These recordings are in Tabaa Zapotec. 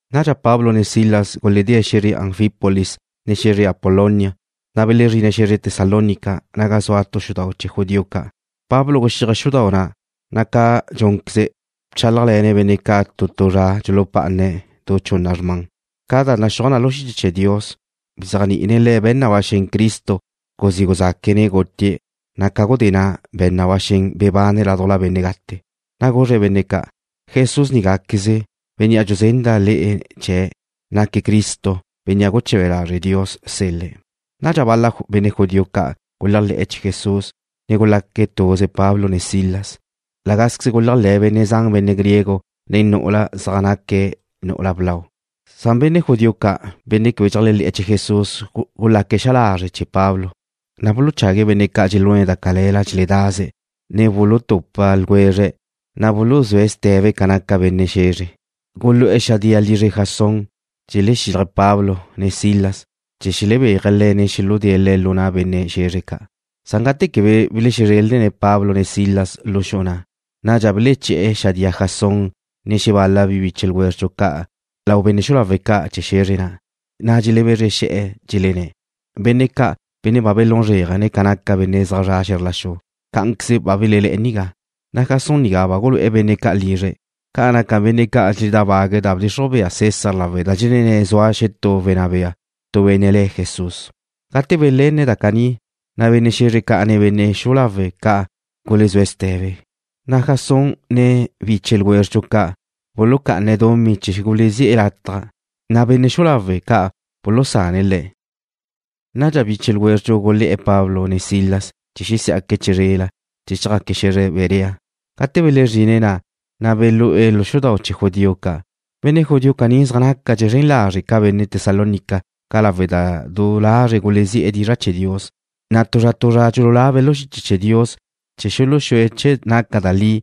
Nadxa Pablo ne Silas guledée̱' xe̱zre Anfípolis, ne xe̱zre Apolonia, na' belezrine̱' xe̱zre Tesalónica, naga zua tu xudau' chee̱ judío ca'. Pablo guxíaje̱' xudau' na', na' ca dxúnqueze̱' bchálajle̱ne̱' benne' ca' tu tu zra dxulupá'ane̱' du chunna da gazre zra. Ca da naxúaj na lu xiche chee̱ Dios, bzéajni'ine̱' le̱' be̱n na ba xen Cristo guzí guzaque̱', ne gutie̱', na' ca gudé na' be̱n na ba xen bebane̱' ládujla benne' gate. Na' guzre̱' benne' ca': ―Jesús nigáqueze, bénnea' dxuzenda' le'e chee̱', naque̱' Cristo, Bénnea' guche̱be lazre' Dios sel-le̱'. Nadxa bal-la benne' judío ca' guléajle̱'e̱ chee̱ Jesús, ne gulaque̱' tuze Pablo ne Silas. La gázqueze guléajle̱ benne' zan benne' griego, ne nu'ula zan zaj naque̱' nu'ula blau. Benne' judío ca', benne' quebe dxeléajle̱'e̱ chee̱ Jesús gulaque̱' xa lazre' chee̱ Pablo, na' buluchague̱' bal-la benne' ca' dxelune̱' da cale̱la dxeledaze̱', ne bulutupa ljwezre̱', na' buluzúe̱' ste̱be ca naca benne' xe̱zre. Gulu'e̱ xadía lizre Jasón, dxelexílaje̱' Pablo ne Silas, chee̱ xelebéaje̱' le̱', ne xuludée̱' le̱' lu na' benne' xe̱zre ca'. Gate quebe belexezrelne̱' Pablo ne Silas lu xu'u na', nadxa beleché̱'e̱ xadía Jasón ne xebal-la biche ljwézredxu ca' lau benne' xu'u lawe' ca' chee̱ xe̱zre, na' dxelebezre xe̱'e̱, dxelenné̱': ―Benne' ca', benne' ba belún zréajene̱' ca naca benne' zaj zre̱'e̱ xe̱zr la xu, cá'anqueze ba belelé̱'e̱ nigá. Jasón nigá ba gulu'e̱ benne' ca' lizre̱'. Ca naca benne' ca' dxeledábague̱' da bdxixruj bea César lawe' da dxelenné̱' zua xetú wenná bea, tu benne' le̱' Jesús. Gate belenne̱' da caní, na' benne' xe̱zre ca', ne benne' xu'u lawe' ca' gulezúe̱' ste̱be. Jasón, ne biche ljwézredxu ca' bulucá'ane̱' dumí chee̱ gulezí'e̱ lataj, na' benne' xu'u lawe' ca' bulusane̱' le̱'. Nadxa biche ljwézredxu gulé̱'e̱ Pablo ne Silas chee̱ xesí'aque̱' chizrela, chee̱ chjaque̱' xe̱zre Berea. Gate belezrine̱' na', na' belú'e̱ lu xudau' chee̱ judío ca'. Benne' judío caní zaj nácadxe̱' zren lazre' ca benne' Tesalónica ca' lawe' da du lazre̱' gulezí'e̱ dizra' chee̱ Dios, na' tu zra tu zra dxululabe̱' lu xiche chee̱ Dios chee̱ xuluxúe̱' che naca da li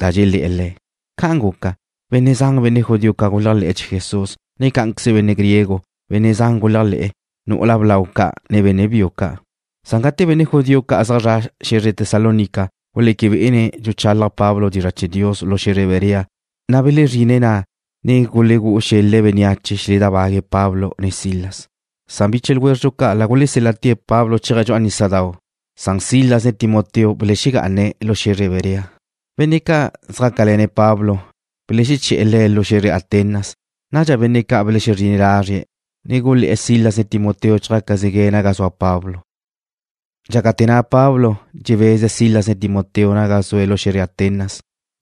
da dxelé̱'e̱ le̱'. Ca'an guca, benne' zan benne' judío ca' guléajle̱'e̱ chee̱ Jesús, ne cá'anqueze benne' griego. Benne' zan guléajle̱'e̱, nu'ula blau ca', ne benne' biu ca'. Gate benne' judío ca' zaj zre̱'e̱ xe̱zre Tesalónica guleque bé'ene̱' dxuchalaj Pablo dizra' chee̱ Dios lu xe̱zre Berea, na' belezrine̱' na', ne gulegú'u xel-le̱' bénneache chee̱ xeledábague̱' Pablo ne Silas. Biche ljwézredxu ca' la gulesél-la'te̱' Pablo chéaje̱' dxu'a nísadau', na' Silas ne Timoteo belexegá'ane̱' lu xe̱zre Berea. Benne' ca' zjácale̱ne̱' Pablo beleché̱'e̱ le̱' lu xe̱zre Atenas. Nadxa benne' ca' belexezrine̱' lazrie̱', ne gulé̱'e̱ Silas, ne Timoteo chjácazegue̱' naga zua Pablo. Dxácate̱ na' Pablo dxebeze̱' Silas ne Timoteo naga zue̱' lu xe̱zre Atenas,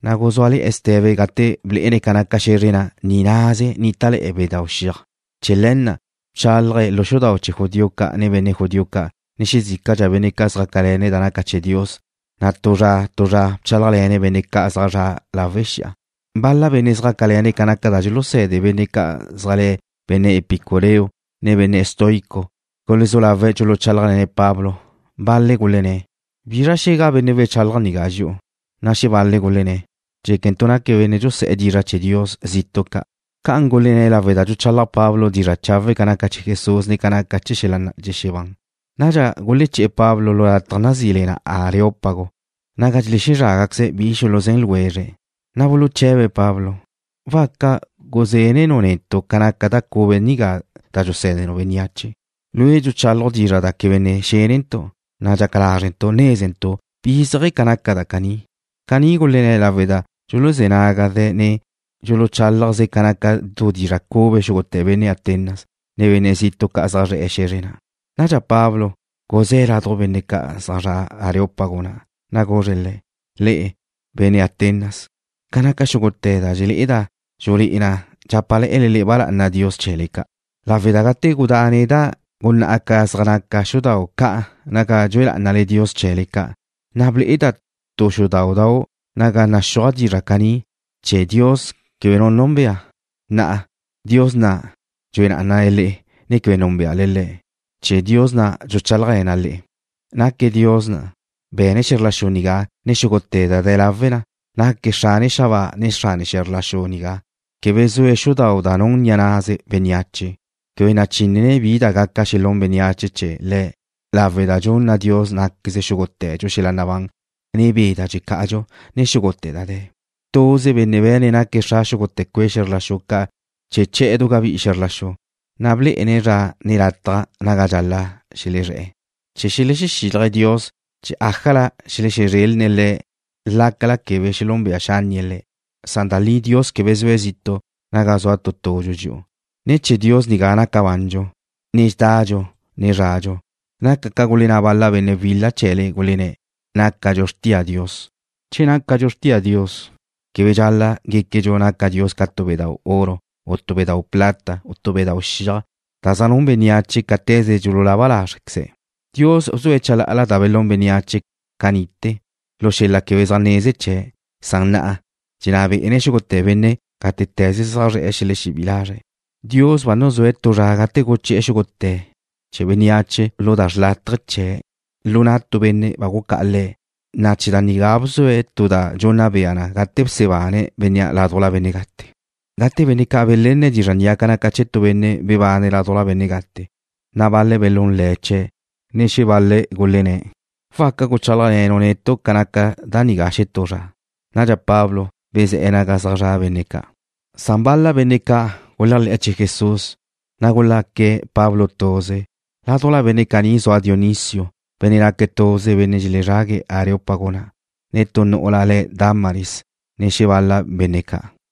na' guzúale̱'e̱ ste̱be gate blé'ene̱' ca naca xe̱zre na', ni' naze nítale̱'e̱ bedáu' xiaj. Chee̱ le̱ na' bchálaje̱' lu xudau' chee̱ judío ca' nen benne' judío ca', ne xezícala benne' ca' zjácale̱ne̱' da naca chee̱ Dios, na' tu zra tu zra bchálajle̱ne̱' benne' ca' zaj zre̱'e̱ lawe' xi'a. Bal-la benne' zjácale̱ne̱' ca naca da dxuluse̱de benne' ca' zaj le̱' benne' epicureo, ne benne' estoico gulezú lawe̱' dxuluchálajle̱ne̱' Pablo. Bal-le̱' gulenné̱': ―¿Bizra xe̱ga benne' wechalaj nigá dxi'u? Na' xebal-le̱' gulenné̱': ―Dxéquentu' naque̱' benne' dxuse dizra' chee̱ dios zitu' ca'. Ca'an gulenné̱' lawe' da dxuchalaj Pablo dizra' chawe' ca naca chee̱ Jesús, ne ca naca chee̱ xel-la' dxexebán. Nadxa guleché̱'e̱ Pablo lu lataj nazí le na Areópago, naga dxelezrágaqueze̱' bi xuluzén ljwezre̱'. Na' buluche̱be̱' Pablo: ―¿Waca guzénenu' netu' ca naca da cube nigá da dxusé̱denu' bénneache? Lue' dxuchálaju' dizra' da quebe ne xénentu', na' dxaca lázrentu' nézentu' bi zéaje̱ ca naca da caní. Caní gulenné̱' lawe' da dxuluzé̱ nágaze, ne dxuluchálajze ca naca tu dizra' cube xúgute̱ benne' Atenas, ne benne' zitu' ca' zaj zre̱'e̱ xe̱zre na'. Nadxa Pablo guzé̱' laduj benne' ca' zaj zre̱'e̱ Areópago na', na' guzre̱' le̱': ―Le'e, benne' Atenas, ca naca xúgute̱ da dxelé'eda', dxulé'e na dxápale̱'e̱le ba lá'ana dios chee̱le ca', lawe' da gate gudá' neda' gunná'a ca zaj naca xudau' ca' naga dxue lá'anale dios chee̱le ca', na' ble'eda' tu xudáudau' naga naxúaj dizra' caní: Chee̱ Dios Quebe Nu Núnbea. Na'a, Dios na' dxue lá'anale le'e, ne quebe núnbeale Le̱', chee̱ Dios na' dxuchálajle̱na' le'e. ’Naque̱' Dios na' be̱ne̱' xe̱zr la xu nigá, ne xúgute̱ da de̱ lawe na. Naque̱' Xrane xabáa, ne Xrane xe̱zr la xu nigá. Quebe zue̱' xudau' da nun ni'a na' bénneache. Quebe nachínene̱' bi da gaca xelún bénneache chee̱ Le̱' lawe' da dxunna Dios ná'queze xúgute̱dxu xel-la' nabán, ne be' da dxeca'adxu, ne xúgute̱ da de̱. ’Tuze benne' be̱ne̱' naque̱' xra xúgute̱ cue' xe̱zr la xu ca' chee̱ che̱'e̱ du gabí'i xe̱zr la xu, na' blé'ene̱' zra, ne lataj naga dxal-la' xelezré̱'e̱, chee̱ xelexexílaje̱' Dios chee̱ ájala xelexezrelne̱' Le̱' lácala quebe xelúnbea xánnie̱' Le̱', san da li Dios quebe zue̱' zitu' naga zua tu tudxu dxi'u. Ne̱ chee̱ Dios nigá naca bandxu, ne dxedadxu, ne zradxu. Naca ca gulenná bal-la benne' wila chee̱le, gulenné̱': “Nácadxu xrtia Dios.” Che nácadxu xrtia Dios, quebe dxal-la' guéquedxu naca Dios ca tu bedáu' oro, u tu bedáu' plata, u tu bedáu' xiaj, da zaj nun bénneache cáte̱ze dxululaba lázrequeze̱'. Dios bzue̱' chalá'ala da belún bénneache ca ni'te̱ lu xel-la' quebe zaj neze chee̱', san na'a dxenná bé'ene̱' xúgute̱ benne' gátete̱ze zaj zre̱'e̱ xelexebí'i lazre̱'. Dios ba nuzúe̱' tu zra gate guchi'e̱ chee̱ xúgute̱ bénneache lu da xrlátaje chee̱' lu na' tu benne' ba gucá'a Le̱', na' chee̱ da nigá bzue̱' tu da dxunna bea na gate bsebane̱' bénnea' ládujla benne' gate. Gate benne' ca' belenne̱' dizra' nigá ca naca chee̱ tu benne' bebane̱' ládujla benne' gate, na' bal-le̱' belún le̱' chee̱', ne xebal-le̱' gulenné̱': ―Waca guchálajle̱nu' netu' ca naca da nigá xetú zra. Nadxa Pablo bezé̱'e̱ naga zaj zra' benne' ca'. Bal-la benne' ca' guléajle̱'e̱ chee̱ Jesús, na' gulaque̱' Pablo tuze. Ládujla benne' caní zua Dionisio, benne' naque̱' tuze nen benne' dxelezrague̱' Areópago na', ne tu nu'ula le̱' Dámaris, ne xebal-la benne' ca'.